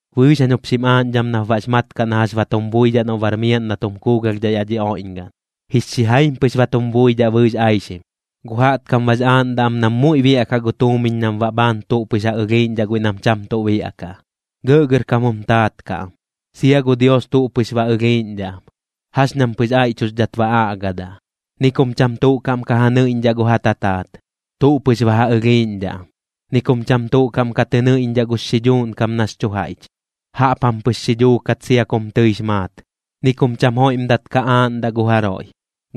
Bɨɨx jañ jup xim aaꞌñdham nap baꞌx mat kaꞌ na jax ba tum buidhaꞌ noꞌ bar miaꞌn na tum kuugalhdhaꞌ yaꞌ dhi oiꞌñgaꞌn. Jix xijaim pɨx ba tum buidhaꞌ bɨɨx aixim. Gu jaꞌtkam bax aaꞌndaꞌ am nam muiꞌ biaꞌkaꞌ gu tuumiñ nam baꞌ bhaan tuꞌ pɨx ja ɨlhiiꞌñdhaꞌ guiꞌ nam cham tuꞌ biaꞌkaꞌ, gɇꞌgɇrkam jum taat kaꞌ am. Sia gu Dios tuꞌ pɨx ba ɨlhiiꞌñdhaꞌ am, jax ñam pɨx aiꞌchuxdhat ba aꞌgadaꞌ. Ni kum cham tuꞌ kaꞌm ka ja nɨiꞌñdhaꞌ gu ja tataat, tuꞌ pɨx ba ja ɨlhiiꞌñdhaꞌ am. Ni kum cham tuꞌ kaꞌm ka tɨ nɨiꞌñdhaꞌ gux xidhuuꞌn kam nax chu jaiꞌch, jaꞌp jam pɨx xi dhuukat sia kum tɨix maat. Ni kum cham joiꞌmdat ka aaꞌndaꞌ gu jaroiꞌ,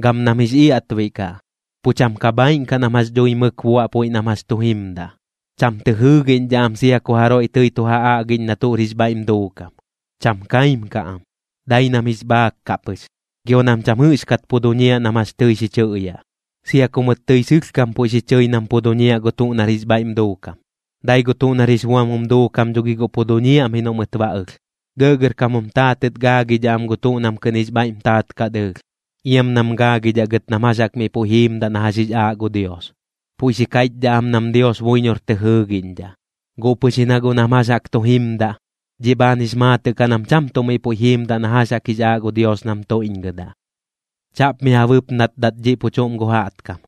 gam nam jix iaꞌtbiꞌ kaꞌ. Pu cham ka bhaaiꞌn kaꞌ nam jax dhui mɨk buaꞌ puiꞌ nam jax chu jimdaꞌ. Cham tɨ jɨɨgiꞌñdhaꞌ am sia ku jaroiꞌ tɨi tu ja aꞌgiꞌñ na tuꞌr jix bhaiꞌm duukam. Cham kaim kaꞌ am, dai nam jix bhaak kaꞌ pɨx. Gio nam cham jɨꞌxkat pu duñiaꞌ nam jax tɨi xi chɨꞌyaꞌ, sia ku mɨt tɨi sɨlhkam puiꞌ xi chɨi nam pu duñiaꞌ gu tuꞌ nar jix bhaiꞌm duukam, dai gu tuꞌ nar jix buam jum duukam dho gi guꞌ pu duñiaꞌm ji noꞌ mɨt ba ɨlh. Gɇꞌgɇrkam jum taatɨt gaagidhaꞌ am gu tuꞌ nam kɨꞌn jix bhaiꞌm taat kaꞌ dɨɨlh, iam nam gaagidhaꞌ gɨt nam jax jaꞌk miꞌ puiꞌ jiimdaꞌ na jax jix aaꞌ gu Dios. Puiꞌ xi kaiꞌchdhaꞌ am nam Dios buiñor tɨ jɨɨgiꞌñdhaꞌ, guꞌ pɨx ji na guꞌ nam jax jaꞌk tu jimdaꞌ, dhiꞌ bhaan jix maatɨꞌ kaꞌ nam cham tuꞌ miꞌ puiꞌ jiimdaꞌ na jax jaꞌk jix aaꞌ gu Dios nam tuiꞌñgɨdaꞌ. Chaꞌp mi ja bɨpnatdat dhiꞌ pu chuꞌm gu jaꞌtkam.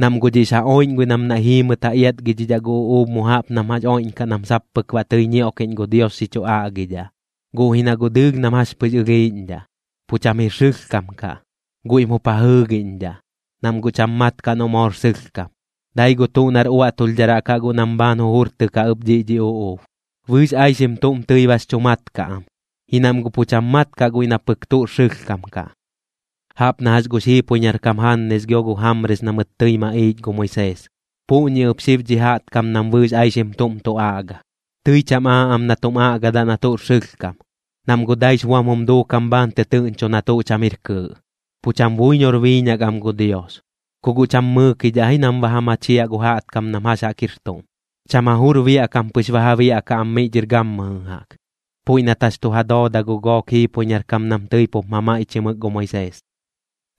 Nam guꞌ dhiꞌx ja oiꞌñ guiꞌ nam naiꞌ jiimɨt ja iatgidhidhaꞌ gu uꞌuub mu jaꞌp nam jax oiꞌñkaꞌ nam sap pɨk baꞌ tɨi ñioꞌkiꞌñ gu Dios xi chu aꞌgidhaꞌ, guꞌ ji na guꞌ dɨɨlh nam jax pɨx ɨlhiiꞌñdhaꞌ, pu cham jir sɨlhkam kaꞌ. Guiꞌm jup ja jɨɨgiꞌñdhaꞌ, nam guꞌ cham mat kaꞌ noꞌ moor sɨlhkam. Dai gu tuꞌ nar uaꞌtulhdharaꞌ kaꞌ guꞌ nam bhaan jujurtɨkaꞌ ɨp dhiꞌ dhi uꞌuub. Bɨɨx aixim tuꞌm tɨi bax chu mat kaꞌ am, ji nam guꞌ pu cham mat kaꞌ guiꞌ na pɨk tuꞌr sɨlhkam kaꞌ. Jaꞌp na jax gux jiipoiñar kam Jannes gio gu Jamres na mɨt tɨi maꞌiich gu Moisees, puꞌñi ɨp xib dhi jaꞌtkam nam bɨɨx aixim tuꞌm tu aꞌga. Tɨi cham aaꞌ am na tum aꞌgadaꞌ na tuꞌr sɨlhkam, nam guꞌ daix buam jum duukam bhaan tɨtɨɨꞌñcho na tuꞌ cham jir kɨɨꞌ, pu cham buiñor biiñak am gu Dios. Ku guꞌ cham mɨɨkidhaꞌ ji nam ba ja machiaꞌ gu jaꞌtkam nam jax jaꞌk jir tuꞌm. Cham ja jur biaꞌ kam pɨx ba ja biaꞌkaꞌ am miꞌ dhɨr gammɨjɨ jaꞌk, puiꞌ nat jax tu ja dooda gu gook jiipoiñar kam nam tɨi pup mamaiꞌchimɨk gu Moisees.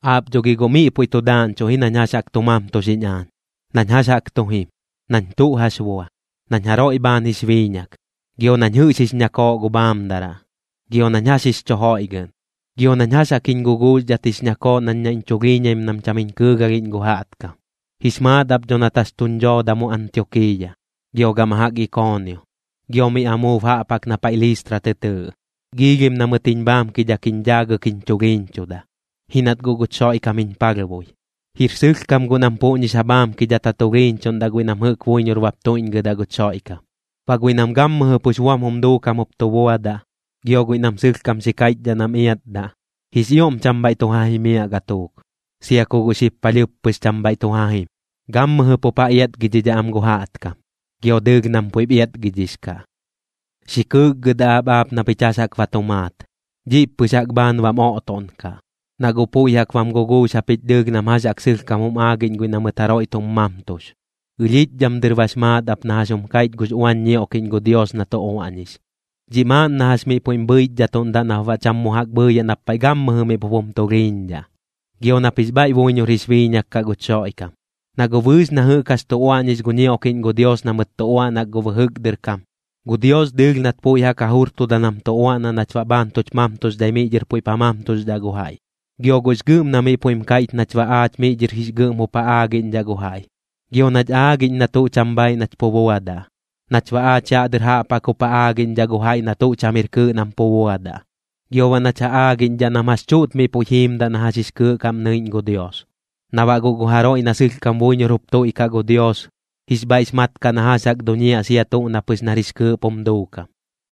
Aap dho gi guꞌ miꞌ puiꞌ tu daaꞌñchuꞌ ji nañ jax jaꞌk tu mamtuxiꞌñ aañ, nañ jax jaꞌk tu jim, nañ tuꞌ jax bua, nañ jaroiꞌ bhaan jix biiñak, gio nañ jɨꞌx jix ñakooꞌ gu bhaamdaraꞌ, gio nañ jax jix chu joiꞌgɨꞌn, gio nañ jax jaꞌk jiñ guguuxdhat jix ñakooꞌ nañ naiꞌñ chulhiiñaim nam cham jiñ kɨɨgalhiꞌñ gu jaꞌtkam. Jix maat ap dho nat jax tuñ dhooda mu Antiokiiya, gio gama jaꞌk Ikoonio, gio miꞌ amuub jaꞌp jaꞌk na paiꞌ Listra tɨ tɨɨꞌ. Giilhim na mɨt jiñ bhaamkidhak jiñ dhaagɨk jiñ chulhiiñchuda, ji nat guꞌ guch Xoiꞌkam jiñ palhbui. Jir sɨlhkam guꞌ nam puꞌñix ja bhaamkidhat ja tulhiiñchuꞌndaꞌ guiꞌ nam jɨꞌk buiñor bap tuiꞌñgɨdaꞌ guch Xoiꞌkam. Baꞌ guiꞌ nam gammɨjɨ pux buam jum duukam jup tu buadaꞌ, gio guiꞌ nam sɨlhkam xi kaiꞌchdhaꞌ nam iatdaꞌ, jix ioꞌm cham bhaiꞌ tu ja jimiaꞌ gatuuk, sia ku guꞌ xib palhɨɨp pɨx cham bhaiꞌ tu ja jim. Gammɨjɨ pup ja iatgidhidhaꞌ am gu jaꞌtkam, gio dɨɨlh nam puiꞌp iatgidhix kaꞌ. Xi kɨɨkgɨdaꞌ ap aap na pich jax jaꞌk ba tu maat. Dhiꞌp pɨx jaꞌk bhaan bam oꞌtoꞌnkaꞌ, na guꞌ puiꞌ jaꞌk bam guguux japich dɨɨlh nam jax jaꞌk sɨlhkam jum aagiꞌñ guiꞌ na mɨt jaroiꞌ tum mamtux. Ɨlhiꞌch dhɨm dɨr bax maat ap na jax jum kaiꞌch gux uañ ñioꞌkiꞌñ gu Dios na tu uaꞌñix. Dhiꞌ maaꞌn na jax miꞌ puiꞌm bhɨichdhatuꞌndaꞌ nap baꞌ cham mu jaꞌk bhɨɨyaꞌ nap paiꞌ gammɨjɨ miꞌ pup jum tulhiiñdhaꞌ. Gio nap jix bhaiꞌ buiñor jix biiñak kaꞌ guch Xoiꞌkam. Na guꞌ bɨɨx na jɨꞌk jax tu uaꞌñix gu ñioꞌkiꞌñ gu Dios na mɨt tu uaꞌnak gu bɨjɨk dɨr kam, gu Dios dɨɨlh nat puiꞌ jaꞌk ja jurtuda nam tu uaꞌnaꞌ nach baꞌ bhaan tuch mamtuxdhai miꞌ dhɨr puiꞌp ja mamtuxdhaꞌ gu jaiꞌ. Gio guꞌx gɨꞌm na miꞌ puiꞌm kaiꞌch nach baꞌ aach miꞌ dhɨr jix gɨꞌm jup ja aagiꞌñdhaꞌ gu jaiꞌ. Gio nach aagiꞌñ na tuꞌ cham bhaaiꞌ nach pu buadaꞌ, nach baꞌ aach yaꞌ dɨr jaꞌp jaꞌk jup ja aagiꞌñdhaꞌ gu jaiꞌ na tuꞌ cham jir kɨɨꞌ nam pu buadaꞌ. Gio baꞌ nach ja aagiꞌñdhaꞌ nam jax chuꞌt miꞌ puiꞌ jiimdaꞌ na jax jix kɨɨꞌ kaꞌm nɨiꞌñ gu Dios, na baꞌ guꞌ gu jaroiꞌ na sɨlhkam buiñor jup tuiꞌkaꞌ gu Dios, jix bhaiꞌx mat kaꞌ na jax jaꞌk duñiaꞌ sia tuꞌ na pɨx nar jix kɨɨꞌp jum duukam.